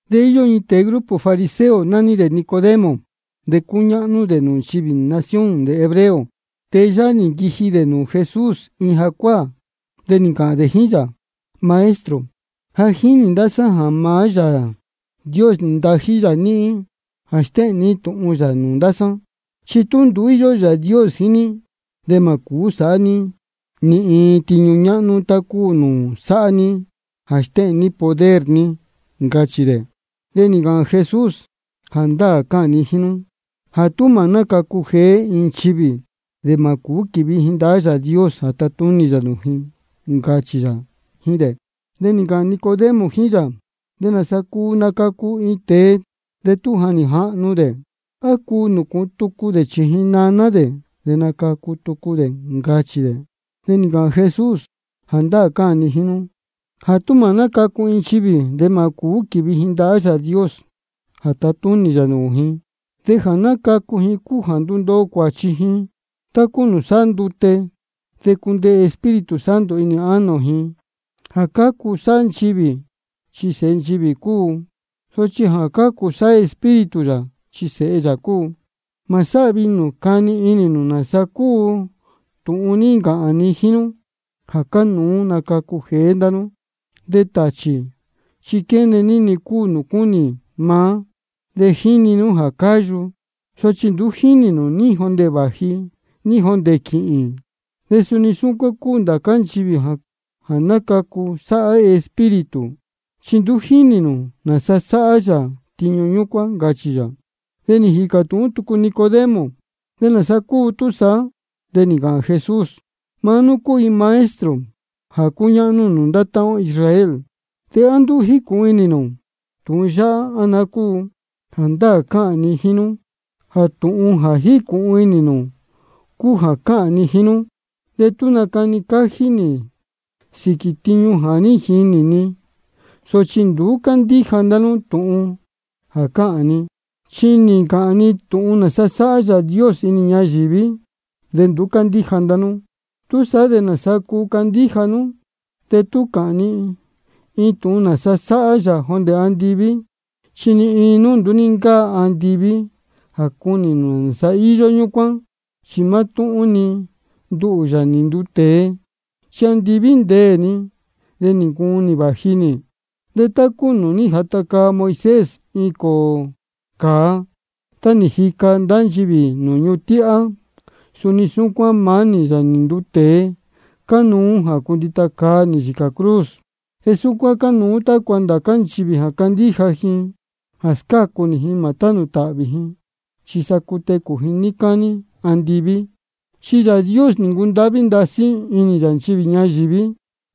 De íyó iin tēe grupo fariseo, nání dē Nicodemo, de cúñáhnú dē nūū nchivī nación dē hebreo. Tēe yáhá nī nquiji dē nūū Jesús iin jacuáā, de nī ncāhān dē jíín yā: Maestro, ja jínī ndá sá jā maá Yāā Dios nī ntají yā níhín jā stéhēn ní tūhun yā nūū ndá sá. Chi tú nduú íyó Yāā Dios jíín ní, de mā cūú sāhá ní ni iin tiñu ñáhnú tá cúu nūū sáhá ní jā stéhēn ní poder ní, ncachī dē. De nī ncāhān Jesús: Jāndáā cáhān ni jíín nú jā tú mā nácacu jeé iin nchivī, de mā cūú quīvi ji ndahá Yāā Dios jā tatúnī yā nūū ji, ncachī yā jíín dē. De nī ncāhān Nicodemo jíín yā: ¿De nāsa cuu nacacu iin tēe de tú ja nī jahnu dē? ¿A cuu nūcūhun tucu dē chījin naná dē de nacacu tucu dē? ncachī dē. De nī ncāhān Jesús: Jāndáā cáhān ni jíín nú jā tú mā nácacu iin nchivī, de mā cūú quīvi ji ndahá Yāā Dios jā tatúnī yā nūū ji. De jā nácacu ji cúu jā ndúndoo cuāchi ji tá cúu nūū sáhá ndute, de cundeē Espíritu Santo inī ánō ji. Jā cácu sáhá nchivī, chi sēhe nchivī cúu. Sochi jā cácu sáhá Espíritu yā, chi sēhe yā cúu. Mā sáhvi inī nū cani inī nū nāsa cúu tūhun nī ncāhān ni jíín nú jā cánuú nacacu jeé ndá nú. De tāchī chi quéne ní-ni cúu nūū cúnī maá, de jíni nú jā cáyu, sochi nduú jínī nū ní jondē vāji ní jondē quīhīn. De suni súcuán cúu ndācá nchivī jā nácacu sáhá Espíritu, chi nduú jínī nū nāsa sáhá yā tiñu ñúcuán, ncachī yā. De nī jīcā tūhún tucu Nicodemo: ¿De nāsa cúu túsaá? De nī ncāhān Jesús: Maá nú cúu iin maestro jā cúñáhnú nūū ndá táhán ó Israel, ¿de á nduú jícūhun inī nū tūhun yáhá, á naá cúu? Jāndáā cáhān ni jíín nú jā tūhun jā jícūhun inī ni cúu jā cáhān ni jíín nú. De nácani cájí nī sīquī tiñu jā ní jinī ni. Sochi nduú cándíja ndá nú tūhun jā cáhān ni. Chi nī ncāhān ni tūhun nāsa sáhá Yāā Dios inī ñayīví, de nduú cándíja ndá nú. ¿Túsaá de nāsa cuu candíja nú de tú cāhān ni tūhun nāsa sáhá yā jondē andiví? Chi ni iin nduú ní ncáa andiví jā cunī nāsa íyó ñúcuán, chi mátúhún-ni nduhū, Yāā nī nduu tēe. Chi andiví ndéē ni, de nī ncuun nī vāji nī. De tá cúu nūū ní jata caa Moisés iin cōō cāa, tá nī jica ndá nchivī nūū ñuhun tíhá, suni súcuán maá nī, Yāā nī nduu tēe, cánuú jā cundita caa nī yīcā cruz. De súcuán cánuú tácua ndācá nchivī jā candíja ji jā scácu nī ji, mā tánū tāhvī ji, chi sa cutecū ji níí cání andiví. Chi Yāā Dios nī ncundáhví ndasí inī yā nchivī ñayīví.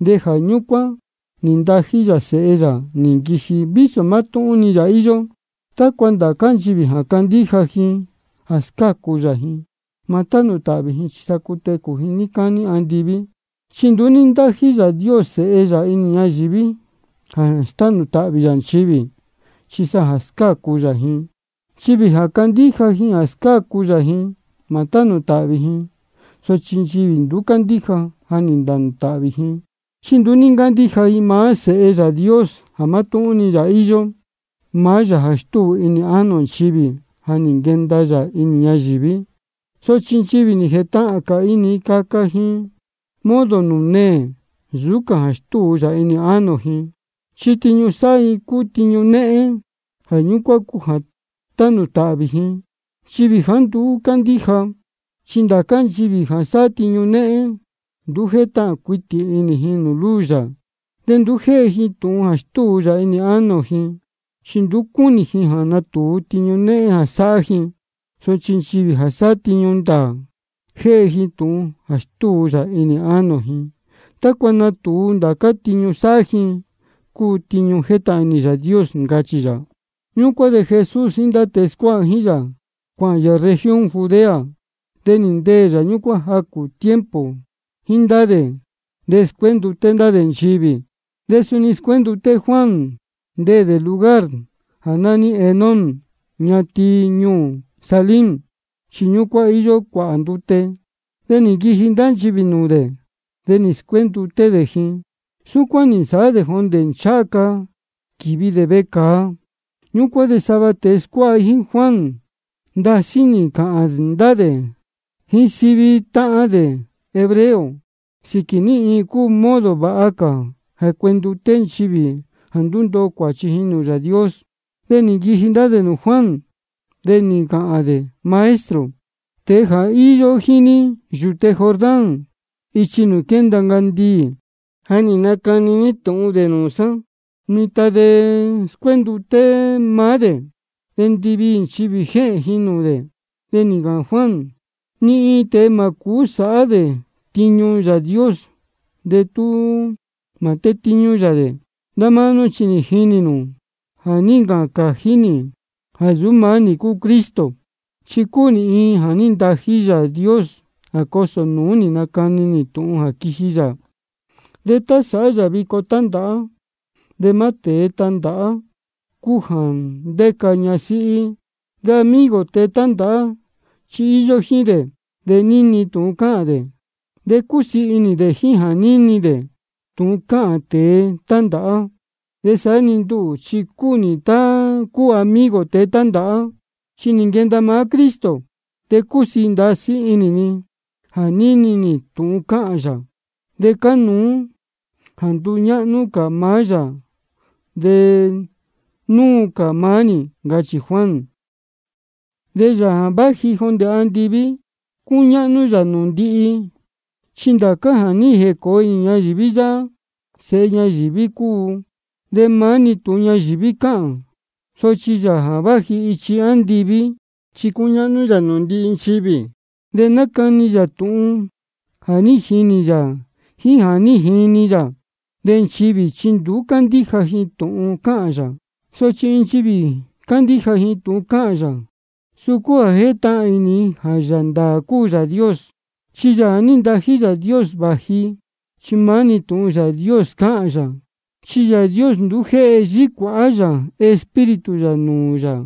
De jā ñúcuán nī ntají yā Sēhe yā nī nquiji, vísō mátúhún-ni yā íyó, tácua ndācá nchivī jā cándíja ji jā scácu yā ji, mā tánū tāhvī ji chi sa cutecū ji níí cání andiví. Chi nduú ní ntájí Yāā Dios Sēhe yā inī ñayīví jā stánū tāhvī yā nchivī, chi sa jā scácu yā ji. Nchivī jā cándíja ji jā scácu yā ji, mā tánū tāhvī ji. Sochi nchivī nduú cándíja, ja nī ntānū tāhvī ji, chi nduú ní ncándíja ji maá Sēhe Yāā Dios, jā mátúhún-ni yā íyó. Maá Yāā jā stúu inī ánō nchivī, ja nī nquenda yā inī ñayīví. Sochi nchivī nī jētahān cā inī ji caca ji modo nūū neē nsūú cā jā stúu yā inī ánō ji, chi tiñu sáhá ji cúu tiñu néhén. Jā ñúcuán cúu jā tānū tāhvī nchivī jāá nduú cándíja. Chi ndācá nchivī jā sáhá tiñu néhén, nduú jétahān cuitī inī ji luz yā. De nduú jéhe ji tūhun jā stúu yā inī ánō ji, chi nduú cúnī ji jā natūu tiñu néhén jā sáhá ji. Sochi nchivī jā sáhá tiñu ndāā, jéhe ji tūhun jā stúu yā inī ánō ji, tácua natūu jā ndācá tiñu sáhá ji cúu tiñu jétahān inī Yāā Dios, ncachī yā. Ñúcuán de Jesús jíín ndá tēe scuáha jíín yā, cuāhān yā región Judea. De nī ndeē yā ñúcuán jacū tiempo jíín ndá dē, de scuénduté ndá dē nchivī. De suni scuénduté Juan, ndéē dē lugar jā nání Enón ñatin ñuū Salim, chi ñúcuán íyó cuāhā ndute. De nī nquiji ndá nchivī nūū dē, de nī scuénduté dē ji. Súcuán nī nsāhá dē jondē ncháha ca quīvi dē vecāa. Ñúcuán de sava tēe scuáha jíín Juan ndasí nī ncāhān ndá dē jíín sava táhán dē hebreo sīquī ní iin cúu modo vāha cā jā cuenduté nchivī jā ndundoo ji nūū Yāā Dios. De nī nquiji ndá dē nūū Juan, de nī ncāhān dē: Maestro, tēe jā ní īyo jíín ní yūte Jordán ichi nūū quénda ncandiī, jā ní nacani ní tūhun dē nūū sá, mitan de scuénduté maá dē, de ndiviī nchivī jéhēn ji nūū dē. De nī ncāhān Juan: Ni iin tēe mā cūú sāhá dē tiñu Yāā Dios de tú mā tétíñú yā dē. Ndá máá nú chi nī jini nú jā ní ncāhān cājí nī jāá nsūú maá nī cúu Cristo, chi cúu nī iin jā ní ntají Yāā Dios jā cosō nūú nacani tūhun jā quiji yā. De tá sáhá nchivī vico tándāhá, de maá tēe tándāhá cúu jā ndéca ñasíhí. De amigo tēe tándāhá chi íyó jíín dē, de níni tūhun cáhān dē. De cúsiī ndasí inī dē jā níni dē tūhun cáhān tēe tándāhá. De saá-ni nduhū, chi cúu nī tá cúu amigo tēe tándāhá. Chi nī nquenda maá Cristo, de cúsiī ndasí inī ni jā níni nī tūhun cáhān yā. De cánuú jā nduñáhnú cā maá yā de nuu cā maá nī, ncachī Juan. De Yāā jā váji jondē andiví, cúñáhnú yā nūū ndihi. Chi ndācá jā ní ncacu inī ñayīví yáhá, sēhe ñayīví cúu, de maá-ni tūhun ñayīví cáhān. Sochi Yāā jā váji ichi andiví, chi cúñáhnú yā nūū ndihi nchivī. De nácani yā tūhun jā ní jinī yā jíín jā ní jini yā. De nchivī chi nduú cándíja ji tūhun cáhān yā. Sochi tú iin nchivī cándíja ji tūhun cáhān yā, suu cúu jā jétúhún ji jā Yāā ndāā cúu Yāā Dios. Chi Yāā jā ní ntají Yāā Dios vāji, chi maá-ni tūhun Yāā Dios cáhān yā. Chi Yāā Dios nduú jéhe yícuāhá yā Espíritu yā nūū Yāā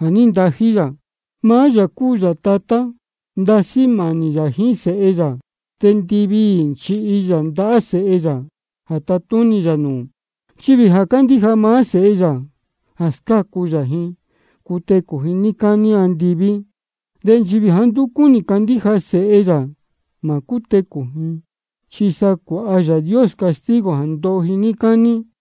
jā ní ntají yā. Maá yā jā cúu yā Tatá, ndasí mānī yā jíín Sēhe yā, de ndiviī nī nchihi yā ndahá Sēhe yā jā tatúnī yā nūū. Nchivī jā cándíja maá Sēhe yā jā scácu yā ji, cutecū ji níí cání andiví. De nchivī jāá nduú cúnī candíja sēhe yā, mā cútecū ji, chi sa cuāha Yāā Dios castigo jā ndoho ji níí cání.